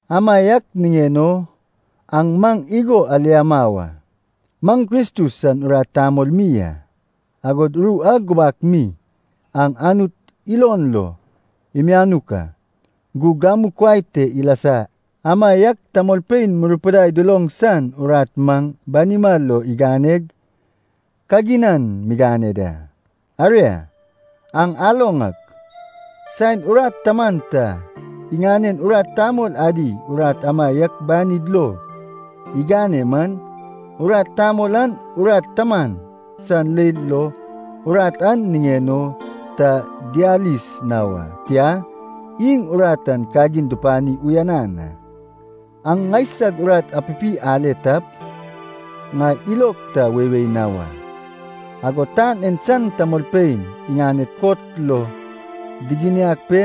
Amaiak niŋen o aŋ maŋ igo aliama wa. Maŋ Kristus san urat tamol mi a, agod ru a gubak mi an Anut ilon lo imianuk a, gug gamu kuai te ilasa amaiak tamolpein murupidai duloŋ san urat maŋ banima lo iganeg, kaginan migane da. Aria, aŋ aloŋ ak, saen urat taman ta iŋanen urat tamol adi urat amaiak banid lo igane man, urat tamol an urat taman san leil lo urat an niŋen o ta diyalis na wa, tia, iŋ urat an kagin dupani uyanan a. Aŋ ŋaisag urat apipi ale tap, ŋai ilog ta weiwei na wa. Agod tan en san tamolpein iŋaned kot lo diginiag pe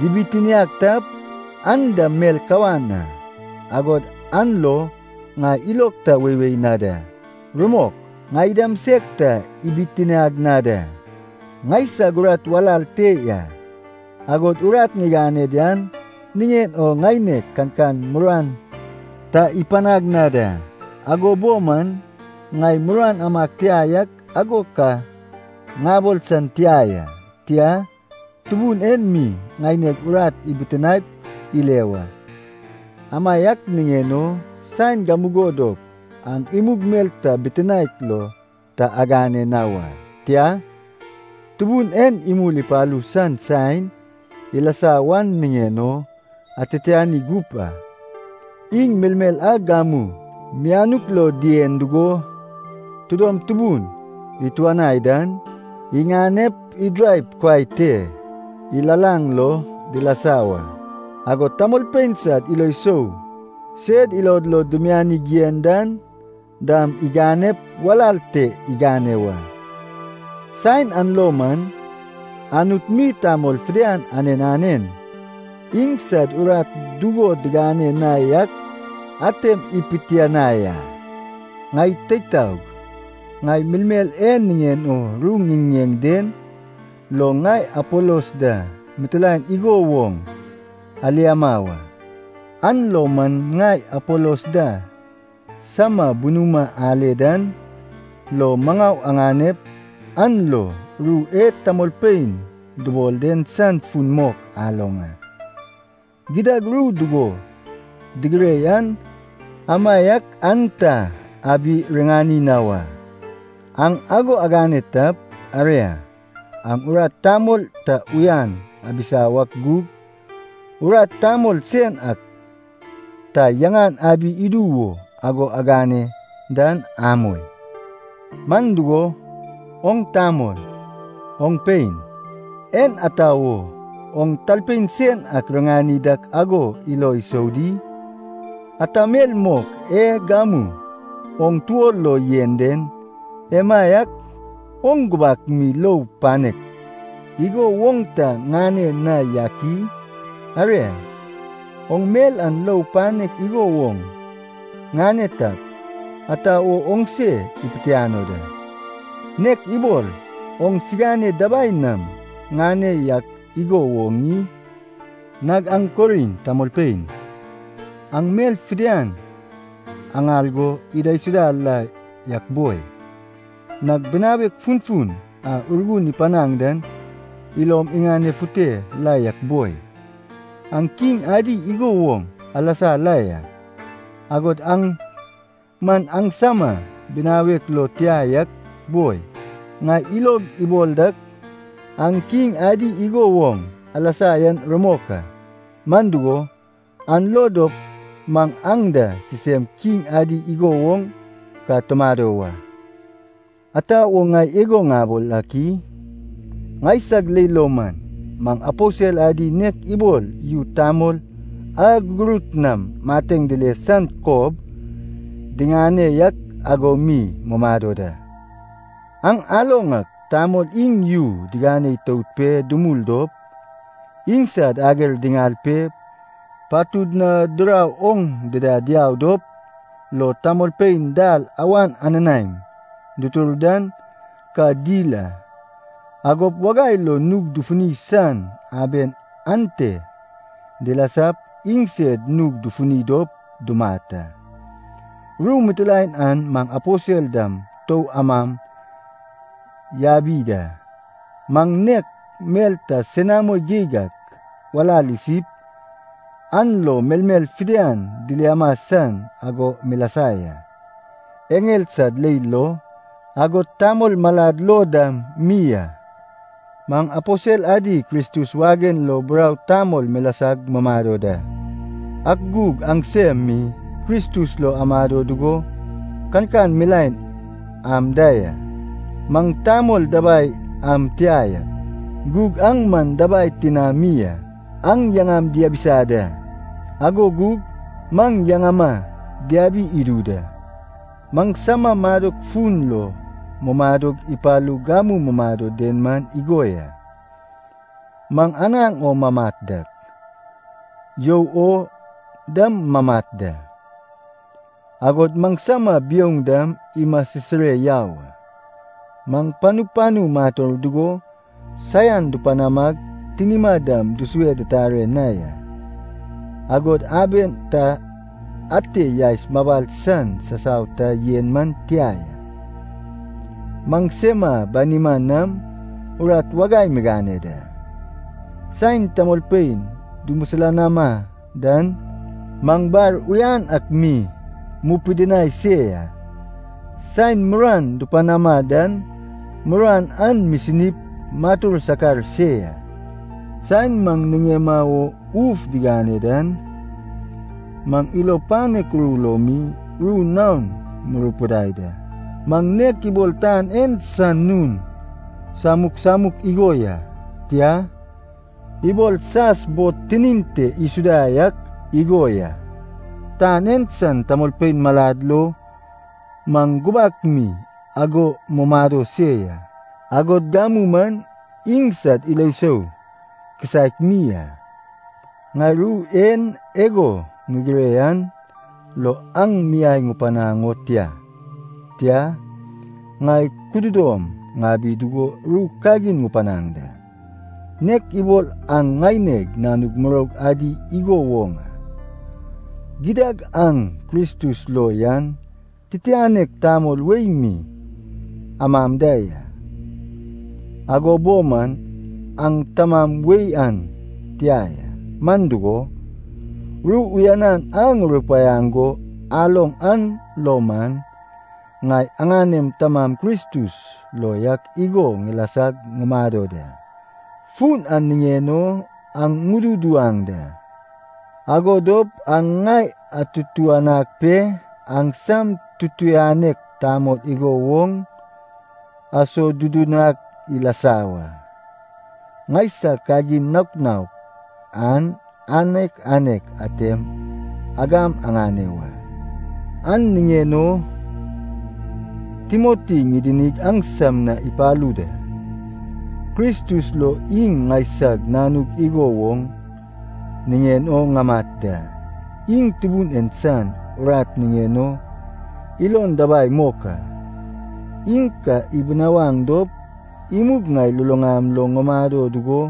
dibitiniag tap, an dam mel kawan a, agod an lo ŋai ilog ta weiwei na da. Rumok, ŋai dam seg ta ibitiniag na da. Ŋaisag urat walal te ya, agod urat ŋigane yan niŋen o ŋaineg kankan muruan ta ipanag na da. Ago bo man ŋai muruan amag tia yak ago ka ŋabol san tia ya. Tia, Tubun en mi ŋaineg urat ibitinaep ile wa. Amaiak niŋen o, saen gamugo dop aŋ imug mel ta bitinaek lo ta agane na wa. Tia, Tubun en imul ipalu san saen ilasa wan niŋen o atitiani gup a. Iŋ melmel a gamu mianuk lo dien dugo tidom tubun ituanai dan, iŋanep idiraip kuai te ilalaŋ lo dilasa wa, agod tamolpein sad ilo sou sed ilod lo dimianig yen dan dam iŋanep walal te igane wa. Saen an lo man, Anut mi tamol fidian anen anen iŋsad urat dugo digane na yak atem ipitianai a. Ŋai teig taog, ŋai melmel e niŋen o ru ŋiŋiŋeŋ den lo ŋai Apolos da mitilaen igo woŋ aliama wa. An lo man ŋai Apolos da sama bunuma ale dan lo maŋau aŋanep an lo, ru e tamolpein dubol den san fun mok aloŋ a. “Gidad ru dugo digire yan amaiak aŋ ta abi-riŋani na wa.” Aŋ ago agane tap, aria, aŋ urat tamol ta yaŋan abisa wak gug urat tamol sen ak ta yaŋan abi idu wo ago agane dan amoi. Man dugo, oŋ tamol, oŋ pein, en ata wo oŋ talpein sen ak riŋani dak ago ilo isou di? Ata mel mok e gamu oŋ tuo lo yen den, emaiak oŋ gubak mi lou panek igo woŋ ta ŋane na yak i? Aria, oŋ mel an lou panek igo woŋ ŋane tap, ata wo oŋ se ipitiano da, nek ibol oŋsigane dabai nam ŋane yak igo woŋ i? Nag aŋ Korint tamolpein, aŋ mel fidian aŋal go idaisuda la yak boi! Nag binawek funfun a Urgun ipanaŋ dan ilom iŋanefute la yak boi! Aŋ kiŋ adi igo woŋ alasa la ya, agod an man maŋsama binawek lo tia yak boi! Ŋai ilog ibol dak aŋ kiŋ adi igo woŋ alasa yan rumok a. Man dugo, an lo dop maŋ aŋ da sisem kiŋ adi igo woŋ ka tumado wa. Ata wo ŋai ago ŋabol ak i? Ŋaisag leil lo man, maŋ aposel adi nek ibol yu tamol a gugurut nam mateŋ dile san kob diŋane yak ago mi mumado da. Aŋ aloŋ ak tamol iŋ yu digane itout pe dumul dop, iŋsad ager diŋal pe patud na dirau oŋ dida diau dop lo tamolpein dal awan ananaem dutur dan ka dil a. Agop wagai lo nug dufuni san aben ante dilasap iŋsed nug dufuni dop dumat a. Ru mitilaen an maŋ aposel dam tou amam yabi da. Maŋ nek mel ta senamo geig ak walal isip, an lo melmel fidian diliama san ago milasa ya, eŋel sad leil lo, agod tamol malad lo dam mi a. Maŋ aposel adi Kristus wagen lo burau tamol milasag mumado da, ak gug aŋsem mi Kristus lo amado dugo kankan milaen am da ya! Maŋ tamol dabai am tia yak, gug aŋ man dabai tinami a! Aŋ yaŋam diabisa da, ago gug maŋ yaŋama diabi idu da! Maŋsama madok fun lo mumadog ipalug gamu mumado den man igo ya. Maŋ anaŋ o mamat dak, you o dam mamat da, agod maŋsama biouŋ dam imasisire yau a. Maŋ panu panu mator dugo saian dupanamag tinima dam dusue ditare na ya, agod aben ta ate yaes mabal san sasau ta yen man tia ya. Maŋsema banima nam urat wagai migane da. Saen tamolpein dumisilanama dan, maŋ bar uyan ak mi mupidinai se ya. Saen muruan dupanama dan, muruan an misinip matur sakar se ya. Saen maŋ niŋema wo uf digane dan, maŋ ilo panek ru lo mi ru naon murupidai da. Maŋ nek ibol tan en san nun samuk samuk igo ya, tia, ibol sas bod tinin te isuda yak igo ya. Tan en san tamolpein malad lo maŋ gubak mi ago mumado se ya, agod gamu man iŋsad ilo sou kisaek mi a. Ŋai ru en ago ŋigire an lo aŋ miai ŋupanaŋ o tia, tia, ŋai kududom ŋabi dugo ru kagin ŋupanaŋ da, nek ibol aŋ ŋaineg nanug muroug adi igo woŋ a. Gidad aŋ Kristus lo yan titianek tamol wei mi amam da ya, ago bo man, aŋ tamam wei an tia ya. Man dugo, ru uyanan a ŋurupaiaŋ go aloŋ an lo man, ŋai aŋanem tamam Kristus lo yak igo ŋilasag ŋumado da. Fun an niŋen o aŋ ŋududuwaŋ da, ago dop aŋ ŋai atutuŋanag pe, aŋsam tutuŋanek tamol igo woŋ asodudunag ŋilasa wa. Ŋaisag kagin naok naok an anek anek atem agam agane wa. An niŋen o Timoti ŋidinig aŋsam na ipalu da, Kristus lo iŋ ŋaisag nanug igo woŋ niŋen o ŋamat da. Iŋ Tubun en san urat niŋen o ilon dabai mok a. Iŋ ka ibinawaŋ dop, imug ŋai luluŋam lo ŋumado dugo,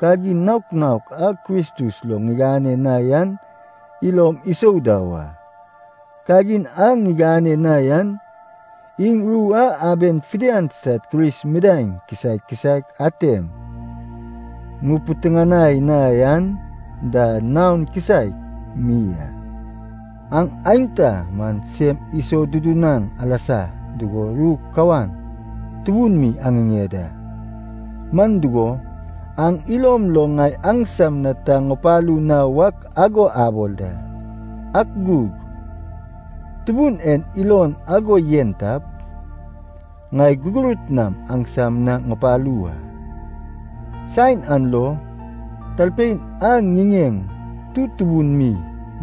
kagin naok naok a Kristus lo ŋigane na yan ilom isou da wa. Kagin a ŋigane na yan, iŋ ru a aben fidian sad Kris midaeŋ kisaek kisaek atem ŋupiteŋanai na yan da, naon kisaek mi a. Aŋ aenta man sem isodudunaŋ alasa dugo ru kawan tubun mi aŋiŋeŋ da, man dugo, aŋ ilom lo ŋai aŋsam na ta ŋupalu na wak ago abol da. Ak gug Tubun en ilon ago yen tap, ŋai gugurut nam aŋsam na ŋupalu wa. Saen an lo, talpein a ŋiŋeŋ tutubun mi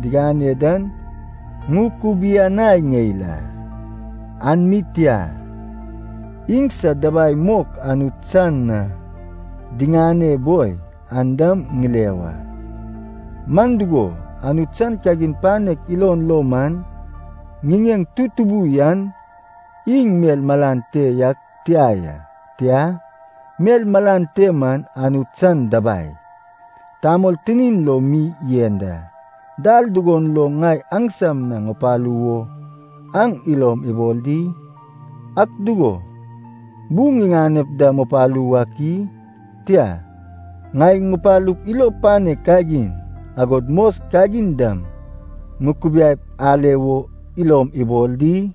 digane dan ŋukubianai ŋeil a. An mi tia, iŋsad dabai mok Anut san na diŋane boi an dam ŋile wa. Man dugo Anut san kagin panek ilon lo man, ŋiŋeŋ tutubu yan iŋ mel malan te yak tia ya, tia, mel malan te man Anut san dabai, tamol tinin lo mi yen da. Dal dugon lo ŋai aŋsam na ŋupalu wo aŋ ilom ibol di? Ak dugo, bu ŋiŋanep da ŋupalu wak i? Tia, ŋai ŋupalup ilo panek kagin, agod mos kagin dam ŋukubiaip ale wo ilom abol di?